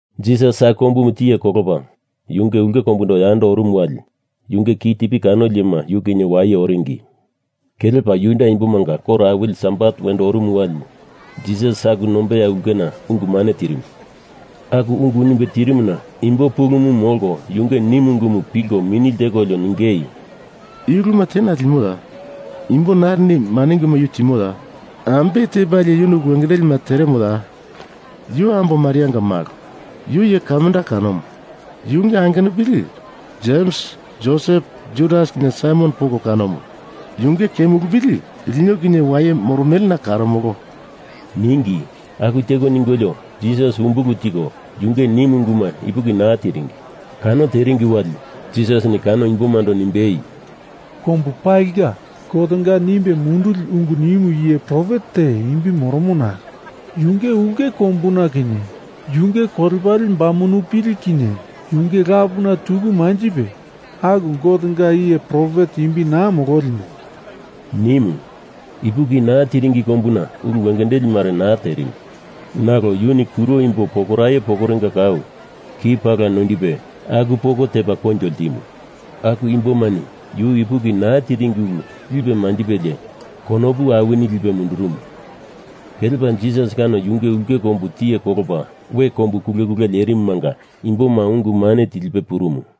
Jisas aku kombumu tiye kolopa yunge ulke kombundo yando orumu wali yunge kitipi kanoli iyema yu kinye waye oringi. Kelepa Juda imbomanga koro awili Sabat wendo orumu wali, Jisas aku nombeya ulkena ungu mane tirimu. Aku ungu nimbe tirimuna imbo pulumu molko yunge nimu ungumu pilko mini ltekolio ningei, “I uluma tena limoya? Imbo narini i mane unguma yu timoya? Ambe tepalie yuni ulu wengendelima teremoya? Yu ambo Marianga malo. Yu iye kamda kanomu. Yunge angenupili, Jems Josep Judas kinye Saimon poko kanomu. Yunge kemulupili lino kinye waye moromelena karomolo,” ningi. Aku teko ningolio Jisas umbulu tiko, yunge nimu unguma ipuki naa tiringi. Kano teringi wali, Jisasini kano imbomando nimbei, “Kombu palinga Gotenga nimbe munduli ungu nimu iye profet te imbi moromo nalo, yunge ulke kombuna kinye yunge kolepale bamunupili kinye yunge lapuna tuku manjipe, aku Gotenga iye profet imbi naa mololimu,” nimu. Ipuki naa tiringi kombuna ulu wengendeli mare naa terimu. Nalo yuni kuro imbo pokoraye pokorenga kau ki pala noindipe aku poko tepa koinjo ltimu. Aku imbomani yu ipuki naa tiringi ulu lipe manjipelie konopu awini lipe mundurumu. Kelepa Jisas kano yunge ulke kombu tiye kolopa we kombu kulekule lerimumanga imboma ungu mane tilipe purumu.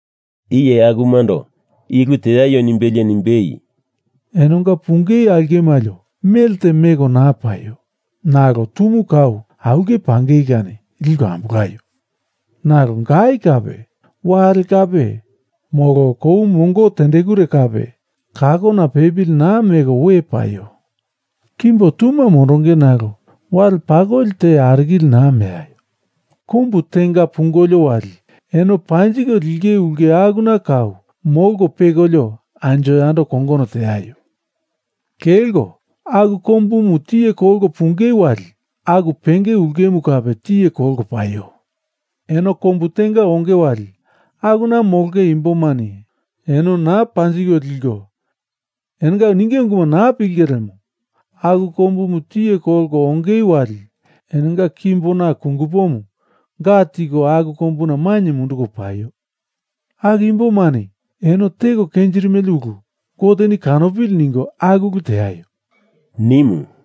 Iye akumando i ulu teaio nimbelie nimbei, “Enonga pungei aulke malio melte meko naa paio, nalo tumu kau aulke pangei kani liko ambolaio. Nalo gai kape, wale kape, molo kou mongo tendekure kape kakona pepili naa meko we paio. Kimbo tuma mondonge nalo wale pakoli te arikili naa meaio. Kombu tenga pungolio wali eno panjiko linge ulke akuna kau molko pekolio anjo yando kongono teaio. Kelko aku kombumu tiye kolko pungei wali aku penge ulkemu kape tiye kolko paio. Eno kombu tenga onge wali, akuna molonge imbomani eno naa panjiko liko, enonga ninge unguma naa pilinge lemo, aku kombumu tiye kolko ongei wali enonga kimbona kungupomu ga tiko aku kombuna mainye munduko paio. Aku imbomani eno teko kenjirimele ulu Goteni kanopili ningo aku ulu teaio,” nimu.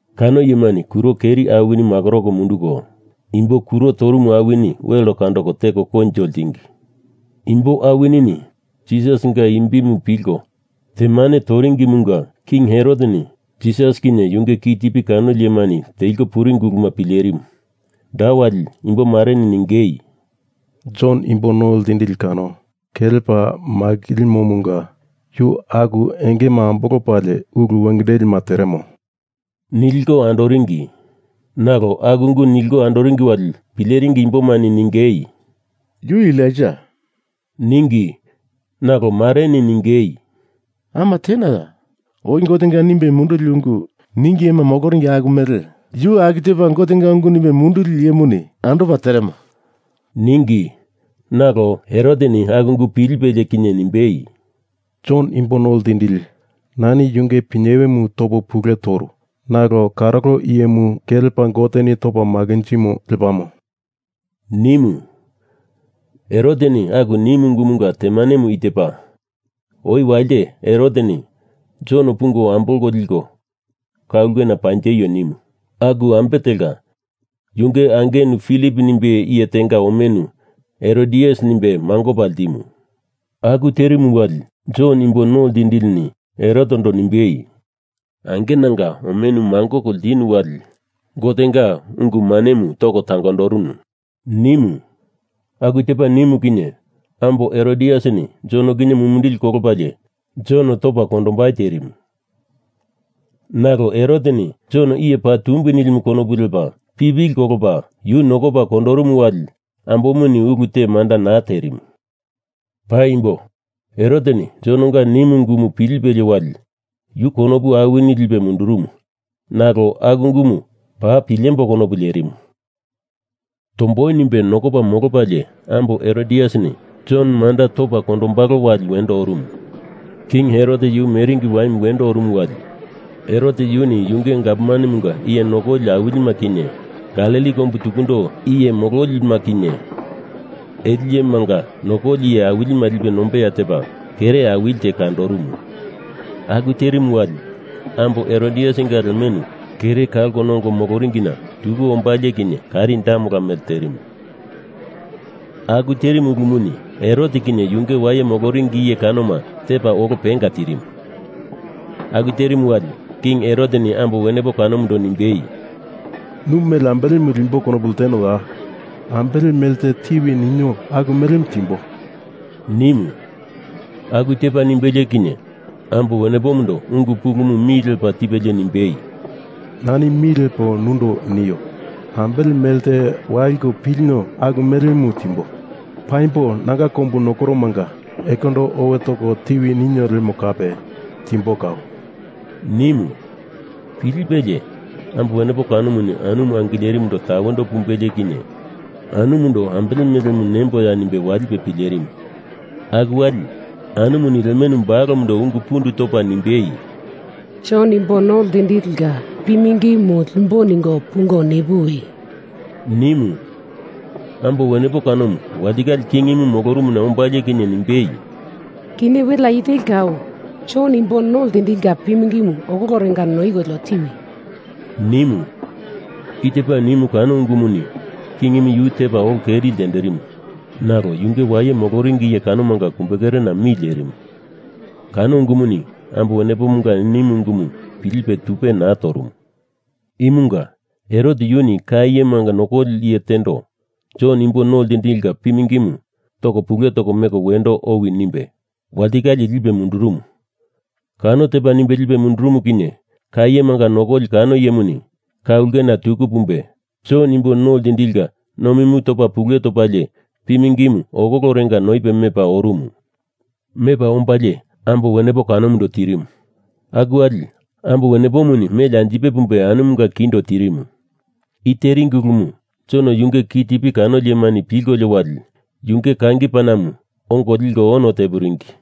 Kano iyemani kuro keri awini makoroko munduko, imbo kuro torumu awini wel kandoko teko koinjo ltingi. Imbo awinini Jisasinga imbimu pilko temane toringimunga King Heroteni Jisas kinye yunge kitipi kanoli iyemani teliko puringi uluma pilerimu. Da wali imbo mareni ningei, “Jon Imbo No Ltindili kano kelepa makilimomunga yu aku engema ambolopalie ulu wengendelima teremo,” niliko andoringi. Nalo aku ungu niliko andoringi wali pileringi imbomareni ningei, “Yu Elaija,” ningi. Nalo mareni ningei, “Ama tenaya, oi Gotenga nimbe munduli ungu ningi iyema moloringi aku mele yu aku tepa Gotenga ungu nimbe munduli iyemuni andopa teremo,” ningi. Nalo Heroteni aku ungu pilipelie kinye nimbei, “Jon imbo no ltindili, nani yunge pinyewemu topo pule toru, nalo karolo iyemu kelepa Goteni topa makinjimo lepamo,” nimu. Heroteni aku nimu ungumunga temanemu i tepa. Oi walite Heroteni Jon pungo ambolko liko ka ulke panjeio nimu. Aku ambe telka, yunge angenu Filip nimbe iye tenga omenu Herodias nimbe mangopa ltimu. Aku terimu wali, Jon imbo no ltindilini Herotendo nimbei, “Angenanga omenu mangoko ltinu wali Gotenga ungu mane toko tangondorunu,” nimu. Aku tepa nimu kinye, ambo Herodiasini Jon kinye mumindili kolopalie Jon topa kondombai terimu, nalo Heroteni Jon iye paa tumbi nilimu konopu lepa pipili kolopa yu nokopa kondorumu wali ambomuni ulu te manda naa terimu. Paimbo, Heroteni Jononga nimu unguma pilipelie wali yu konopu awini lipe mundurumu nalo aku ungumu paa pilembo konopu lerimu. Tomboi nimbe nokopa molopalie ambo Herodiasini Jon manda topa kondombalo wali wendo orumu. King Herot yu meringi waimu wendo orumu wali Herot yuni yunge gavmanemunga iye nokoli awilima kinye, Galili kombu tukundo iye mololima kinye ele iyemanga nokoli iye awilima lipe nombeya tepa kere awilite kandorumu. Aku terimu wali, ambo Herodiasinga lemenu kere kalko nongo moloringina tuku ombalie kinye karendamela mele terimu. Aku terimu ulumuni Herot kinye yunge waye moloringi iye kanoma tepa olo penga tirimu. Aku terimu wali, King Heroteni ambo wenepo kanomundo nimbei, “Nu mele ambelemu limbo konopu ltenoya? Ambele mele te tiwi ninio aku melemu timbo,” nimu. Aku tepa nimbelie kinye, ambo wenepomundo ungu pulumu mi lepa tipelie nimbei, “Nani mi lepo nundo nio, ambele mele te waliko pilinio aku melemu timbo. Paimbo nanga kombu nokoromanga ekondo owe toko tiwi ninio lemo kape timbo kau,” nimu. Pilipelie, ambo wenepo kanomu anumu angilerimuna tawendo pumbelie kinye anumundo ambele melemu nemboya nimbe walipe pilerimu. Aku wali, anumuni lemenu balomundo ungu pundu topa nimbei, “Jon Imbo No Ltindilinga pi mingimu limbo ningo pungo nipuwi,” nimu. Ambo wenepo kanomu walitikale kingimu molorumuna ombalie kinye nimbei, “Kinye welea i teli kau Jon Imbo No Ltindilinga pi mingimu okolorenga noikolio tiwi,” nimu. I tepa nimu kano ungumuni kingimu yu tepa olo keri ltenderimu, nalo yunge waye moloringi iye kanomanga kumbekerena mi lerimu. Kano ungumuni ambo wenepomunga nimu ungumu pilipe tupe naa torumu. Imunga Herot yuni ka iyema nokoli iye tendo Jon imbo no ltindilinga pi mingimu toko pule toko leko mendeko owi nimbe walitikale lipe mundurumu. Kano tepa nimbe lipe mundurumu kinye ka iyema nokoli kano iyemuni ka ulkena tuku pumbe Jon Imbo No Ltindilinga nomimu topa pule topalie pimingimu okolorenga noipe mepa orumu. Mepa ombalie ambo wenepo kanomu tirimu. Aku wali ambo wenepomuni meli anjipe pumbe anumunga kindo tirimu. I teringi ulumu, Jon yunge kitipi kanoli iyemani pilkolio wali, yunge kangi panamu ongo liko ono tepuringi.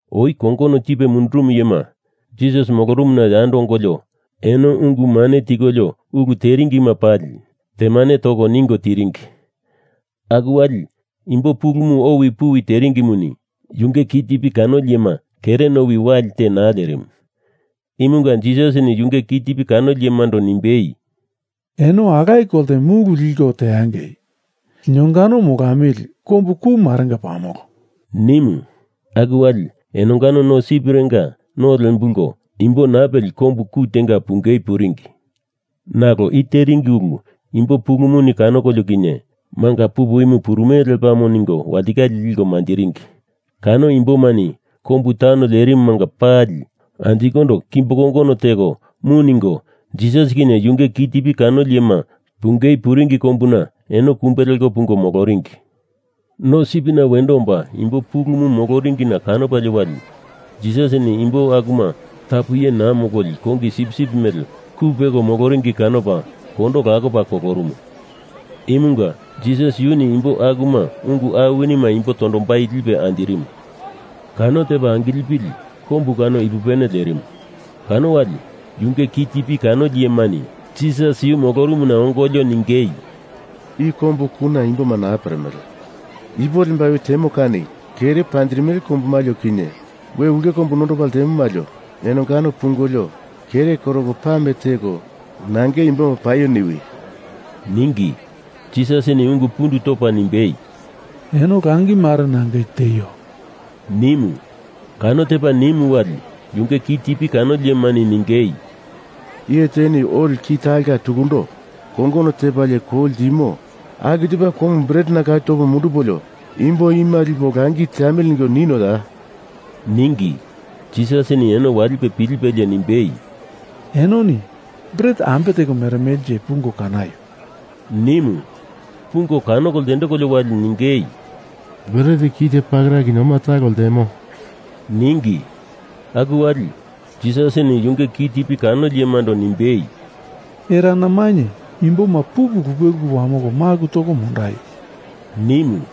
Oi kongono tipe mundurumu iyema Jisas molorumuna yando ongolio eno ungu mane tikolio ulu teringima pali temane toko ningo tiringi. Aku wali imbo pulumu owi puwi teringimuni, yunge kitipi kanoli iyema kere nowi wali te naa lerimu. Imunga Jisasini yunge kitipi kanoli iyemando nimbei, “Eno alaye kolte mulu liko teangei. Linongano molamili kombu ku marenga pamolo,” nimu. Aku wali enongano no sipirenga no lembulko imbo naa peli kombu ku tenga pungei puringi. Nalo i teringi ulu imbo pulumuni kanokolio kinye manga pupu imu purumele lepamo ningo walitikale liko manjiringi. Kano imbomani kombu taun lerimumanga pali anjikondo kimbo kongono teko mu ningo Jisas kinye yunge kitipi kanoli iyema pungei puringi kombuna eno kumbe leko pungo moloringi. No sipina wendo omba imbo pulumu moloringina kanopalie wali, Jisasini imbo akuma tapu iye naa mololi kongi sipsip mele ku peko moloringi kanopa kondo lakopa kolorumu. Imunga Jisas yuni imbo akuma ungu awinima imbo tondombai lipe anjirimu. Kano tepa angilipili kombu kano ipupene lerimu. Kano wali yunge kitipi kanoli iyemani Jisas yu molorumuna ongolio ningei, “I kombu kuna imboma naa peremele. Ipo lembai oi temo kani, kere panjirimele kombu malio kinye we ulke kombu nondopa ltemo malio enongano pungolio kere koroko pame teko nangeindo imboma paio niwi,” ningi. Jisasini ungu pundu topa nimbei, “Eno langi mare nangei tieio,” nimu. Kano tepa nimu wali, yunge kitipi kanoli iyemani ningei, “Iye teni oli ki talonga tukundo kongono tepalie kou ltimo aku tepa koumu bretena kau topo mundupolio imbo ima lipo langi teamili ningo ninoya?” ningi. Jisasini eno walipe pilipelie nimbei, “Enoni bret ambe teko meremelenje pungo kanaio,” nimu. Pungo kanoko ltendekolio wali ningei, “Bret kite pakera kinye oma talo ltemo,” ningi. Aku wali, Jisasini yunge kitipi kanoli iyemando nimbei, “Erana mainye imboma pupu lupe lupe wamoko maku toko mondaio,” nimu.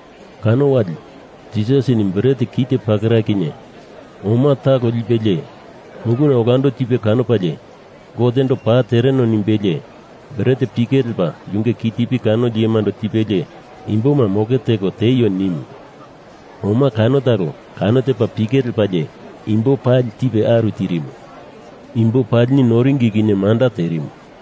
Kano wali, Jisasini bret kite pakera kinye oma talo lipelie, muluna olando tipe kanopalie Gotendo paa tereno nimbelie, bret pike lepa yunge kitipi kanoli iyemando tipelie imboma moke teko tieio, nimu. Oma kano talo kano tepa pike lepalie imbo pali tipe aru tirimu. Imbo palini noringi kinye manda terimu.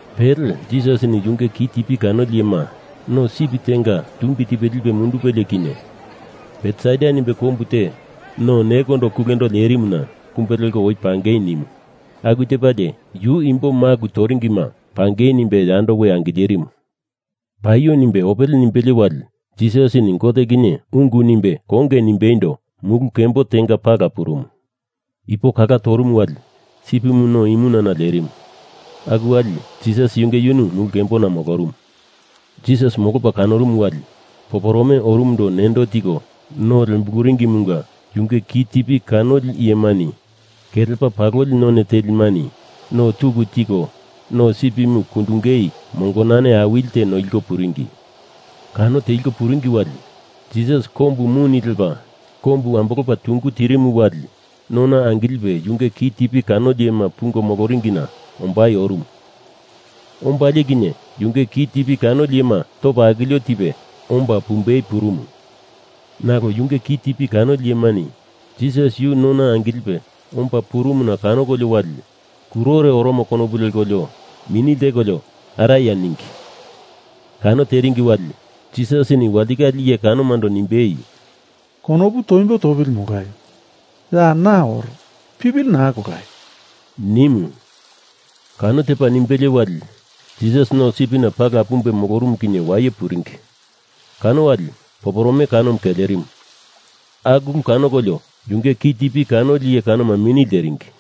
Pele Jisasini yunge kitipi kanoli iyema, no sip tenga tumbi tiko lipe mundupelie kinye Betsaida nimbe kombu te no nekondo kulendo lerimuna kumbe leko oi pangei nimu. Aku tepalie, yu imbo maku toringima pangei nimbe yando we angilerimu. Paio nimbe opele nimbelie wali, Jisasini Gote kinye ungu nimbe konge nimbeindo mulu kembo tenga pala purumu. Ipo kala torumu wali, sipimu no imunana lerimu. Aku wali, Jisas yunge yunu mulu kembona molorumu. Jisas molopa kanorumu wali, poporome orumundo nendo tiko no lembuluringimunga yunge kitipi kanoli iyemani kelepa paloli none telimani no tuku tiko no sipimu kundungei mongonane awilite noliko puringi. Kano teliko puringi wali, Jisas kombu mune lepa kombu ambolopa tungu tirimo wali, nona angilipe yunge kitipi kanoli iyema pungo moloringina ombai orumu. Ombalie kinye, yunge kitipi kanoli iyema topa akilio tipe omba pumbei purumu, nalo yunge kitipi kanoli iyemani Jisas yu nona angilipe omba purumuna kanokolio wali, kurore oromo konopu lekolio mini ltekolio araya ningi. Kano teringi wali, Jisasini walitikale iye kanomando nimbei, “Konopu toimbo topili molaio. Ya na oro. Pipili naa kolaio,” nimu. Kano tepa nimbelie wali, Jisas no sipina pala pumbe molorumu kinye waye puringi. Kano wali poporome kanomu kelerimu. Aku ulu kanokolio yunge kitipi kanoli iye kanoma mini lteringi.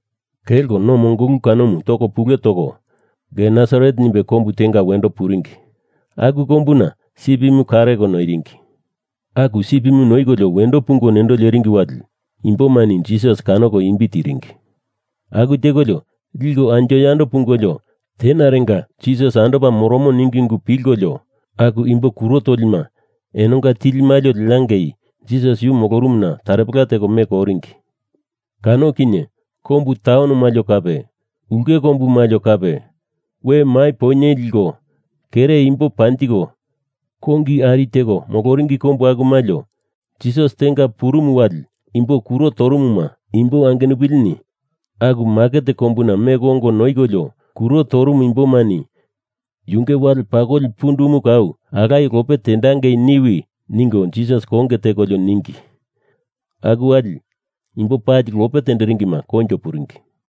Kelko no mongolu kanomu toko pule toko, Genesaret nimbe kombu tenga wendo puringi. Aku kombuna sipimu kareko noiringi. Aku sipimu noikolio wendo pungo nendo leringi wali imbomani Jisas kanoko imbi tiringi. Aku tekolio lkiko anjo yando pungolio tenarenga Jisas andopa moromo ningi ungu pilkolio, aku imbo kuro tolima enonga tili malio leangei Jisas yu molorumuna taropela teko meko oringi. Kano kinye kombu taun malio kape, ulke kombu malio kape, we mai poinye liko kere imbo panjiko kongi ari teko moloringi kombu aku malio, Jisas tenga purumu wali, imbo kuro torumuma imbo angenupilini aku maket kombuna meko ongo noikolio kuro torumu imbomani yunge wale pakoli pundumu kau alaye lope tendangei niwi, ningo Jisas konge tekolio ningi. Aku wali, imbo pali lope tenderingima koinjo puringi.